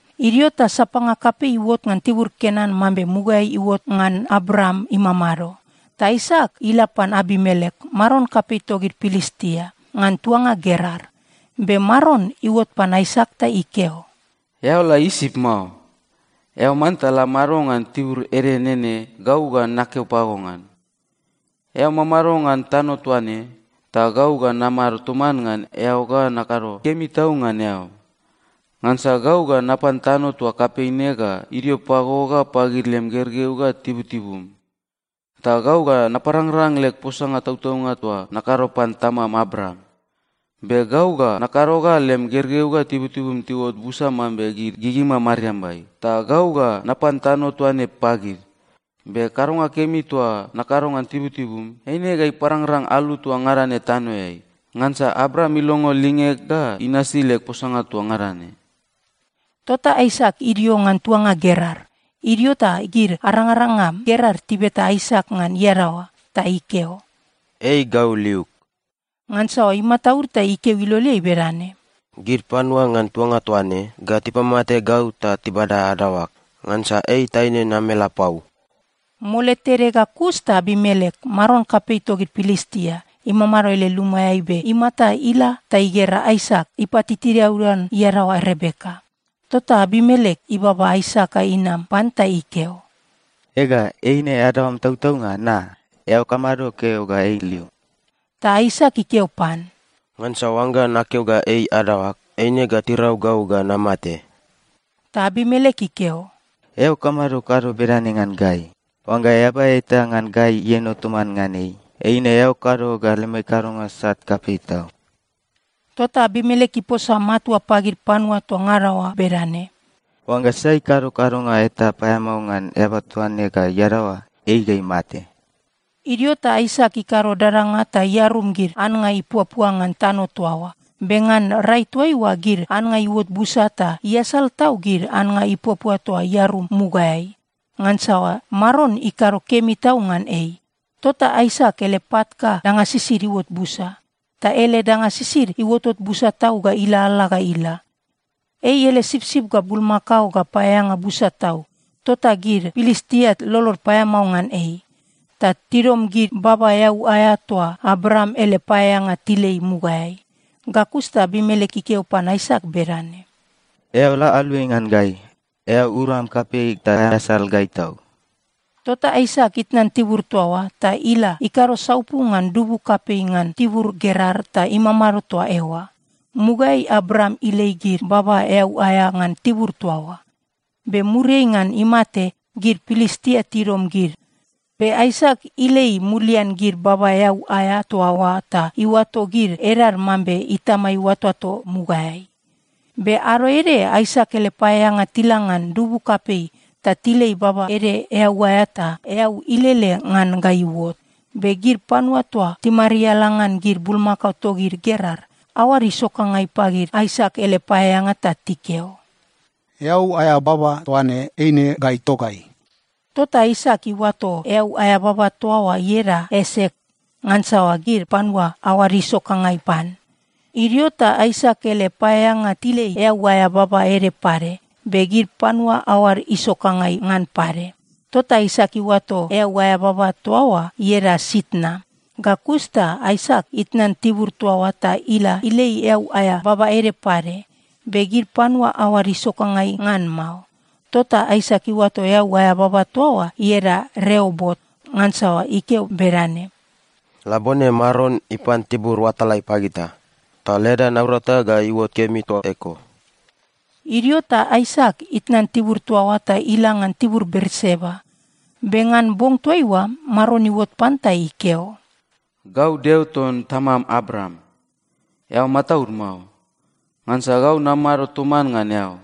Idio ta sapanga kapei iuot ngan tibur Kenan mambe mugaeai iuot ngan Abraam imamado. Ta Aisak ila pan Abimelek, maron kapei togid Pilistia, ngan tuanga Gerar. Be Maron iuot pan Aisak ta ikeo, “Eao la Isip mao. Eao manta la mado ngan tibur ede nene gau ga nakeo pago ngan. Eao mamado ngan tano toa ne, ta gau ga namado toman ngan eao ga nakado kemi tau ngan eao. Ngansa gau ga napan tano toa kapei ne ga idio pago ga pagid lem gergeu ga tibutibum. Ta gau ga naparangrang leg posanga tautaunga toa nakado pan tamam Abraam. Be gau ga nakado ga lem gergeu ga tibutibum tiuot busa mambe gid gigima mariambai, ta gau ga napan tano toa ne pagid. Be kadonga kemi toa nakado ngan tibutibum, eine ga iparangrang alu toa ngada ne tanoeai, ngansa Abraam ilongo lingeg ga inasi leg posanga toa ngada ne.” Tota Aisak idio ngan tuanga Gerar. Idio ta gid arangaranga Gerar tibeta Aisak ngan iadaoa. Ta ikeo, “Ei gau liug.” Ngansa imataud ta ikeo iloleai bedane, “Gid panua ngan tuanga toa ne ga tipamate gau ta tibada adaoag. Ngansa ei taine namelapau.” Mole tede ga kus ta Abimelek, maron kapei togid Pilistia, imamado ele lumaeai be imata ila ta igera Aisak ipatitiaudan iadaoa Rebeka. Tota Abimelek ibaba Aisak ga inam pan ta ikeo, “Ega, eine adaoam tautaunga, na? Eao kamado keo ga ei lium?” Ta Aisak ikeo pan, “Ngansa oangga nakeo ga ei adaoag, eine ga tirau gau ga namate.” Ta Abimelek ikeo, “Eao kamado kado bedane ngan gai? Oangga eaba eta ngan gai ieno toman ngan ei, eine eao kado ga lemai kadonga sat kapei tau.” Tota Abimelek iposa matua pagid panua toa ngada oa bedane, “Oangga sai ikado kadonga eta paeamao ngan eaba toa ne ga iadaoa, ei ga imate.” Idio ta Aisak ikado dadanga ta iarum gid annga ipuapua ngan tano toa oa. Be ngan rai toaiua gid annga iuot busa ta iasal tau gid annga ipuapua toa iarum mugaeai, ngansa Maron ikado kemi tau ngan ei. Tota Aisak ele pat ga danga sisid iuot busa. Ta ele danga sisid iuotot busa tau ga ilalala ga ila. Ei ele sipsip ga bulmakao ga paeaeanga busa tau, tota gid Pilistia lolod paeamao ngan ei. Ta tidom gid baba eau aea toa Abraam ele paeaeanga tilei mugaeai. Ga kus ta Abimelek ikeo pan Aisak bedane, “Eao la aluai ngan gai! Eao uram kapei ta aeasal gai tau.” Tota Aisak itnan tibur toa oa, ta ila ikado saupu ngan dubu kapei ngan tibur Gerar ta imamado toa eoa. Mugaeai Abraam ilei gid baba eau aea ngan tibur toa oa. Be muriai ngan imate, gid Pilistia tidom gid. Be Aisak ilei mulian gid baba eau aea toa oa ta iuato gid edad mambe itama iuatoato mugaeai. Be ado ede, Aisak ele paeaeanga tila ngan dubu kapei ta tilei baba ede eau aea, ta eau ilele ngan ga iuot. Be gid panua toa timariala ngan gid bulmakao togid Gerar, aoad isokangai pagid Aisak ele paeaeanga ta tikeo, “Eau aea baba toa ne eine gai togai.” Tota Aisak iuato eau aea baba toa oa ieda Esek, ngansa gid panua aoad isokangai pan. Idio ta Aisak ele paeaeanga tilei eau aea baba ede pade, be gid panua aoad isokangai ngan pade. Tota Aisak iuato eau aea baba toa oa ieda Sitna. Ga kus ta Aisak itnan tibur toa oa ta ila ilei eau aea baba ede pade. Be gid panua aoad isokangai ngan mao. Tota Aisak iuato eau aea baba toa oa ieda Reobot ngansa ikeo bedane, “Labone Maron ipan tibur oatalai pagita, ta leda naurata ga iuot kemi toa eko.” Idio ta Aisak itnan tibur toa oa ta ila ngan tibur Berseba. Be ngan bong toaiua Maron iuot pan ta ikeo, “Gau Deo ton tamam Abraam. Eao mataud mao, ngansa gau namado toman ngan eao.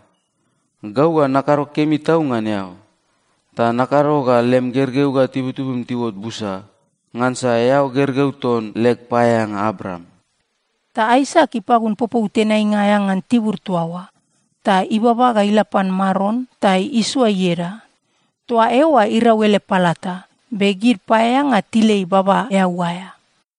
Gau ga nakado kemi tau ngan eao, ta nakado ga lem gergeu ga tibutibum tiuot busa, ngansa eao gergeu ton leg paeaeanga Abraam.” Ta Aisak ipagun popou tenainga aea ngan tibur toa oa, ta ibaba ga ila pan Maron ta isoa ieda. Toa eoa irau ele palata, be gid paeaeanga tilei baba eau aea.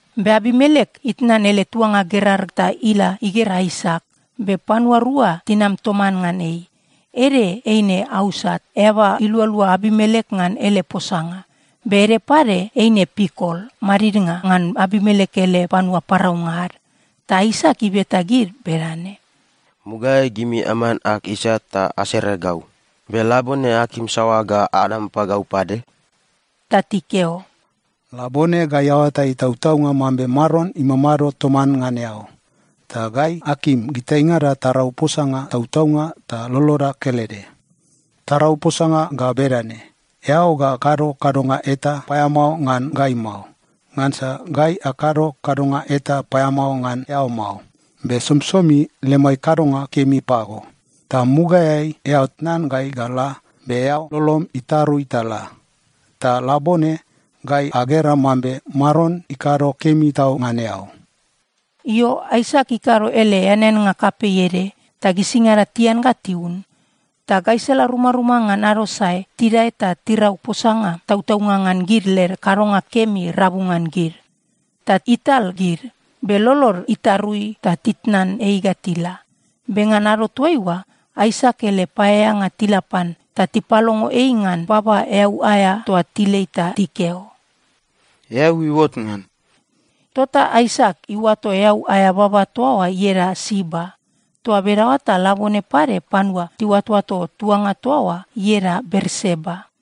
Be Abimelek itnan ele tuanga Gerar ta ila igera Aisak. Be panua rua tinam toman ngan ei. Ede eine Ausat, eaba ilualua Abimelek ngan ele posanga. Be ede pade eine Pikol, madidnga ngan Abimelek ele panua paraunga ad. Ta Aisak ibeta gid bedane, “Mugaeai gimi aman ag isat ta asere gau. Be labone akim saoa ga anam pagau pade?” Ta tikeo, “Labone gai aoatai tautaunga mambe Maron imamado toman ngan eao. Ta gai akim gitaingada tarau posanga tautaunga ta loloda kelede. Tarau posanga ga bedane: Eao ga kado kadonga eta paeamao ngan gai mao. Ngansa gai akado kadonga eta paeamao ngan eao mao, be somisomi lemai kadonga kemi pago. Ta mugaeai eao tnan gai ga la, be eao lolom itarui ta la. Ta labone gai agera mambe Maron ikado kemi tau ngan eao.” Io, Aisak ikado ele eaneannga kapei ede, ta gisingada tian ga tiun. Ta gaisala rumaruma ngan ado sae, tidae ta tirau posanga tautaunga ngan gid led kadonga kemi rabu ngan gid. Ta ital gid, be lolod itarui ta titnan ei ga tila. Be ngan ado toaiua, Aisak ele paeaeanga tila pan ta tipalongo ei ngan baba eau aea toa tilei ta tikeo, “Eau iuot ngan.” Tota Aisak iuato eau aea baba toa oa ieda Siba. Toa bedaoa ta labone pade panua tiuatoato tuanga toa oa ieda Berseba.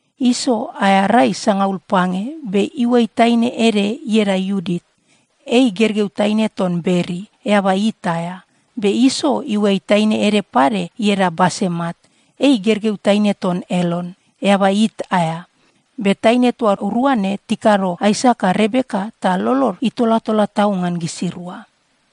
Iso aea rai sangaul pange, be iuai taine ede ieda Iudit. Ei gergeu taine ton Beri, eaba It aea. Be Iso iuai taine ede pade ieda Basemat. Ei gergeu taine ton Elon, eaba It aea. Be taine toa rua ne tikado Aisak ga Rebeka ta lolod itolatola tau ngan gisirua.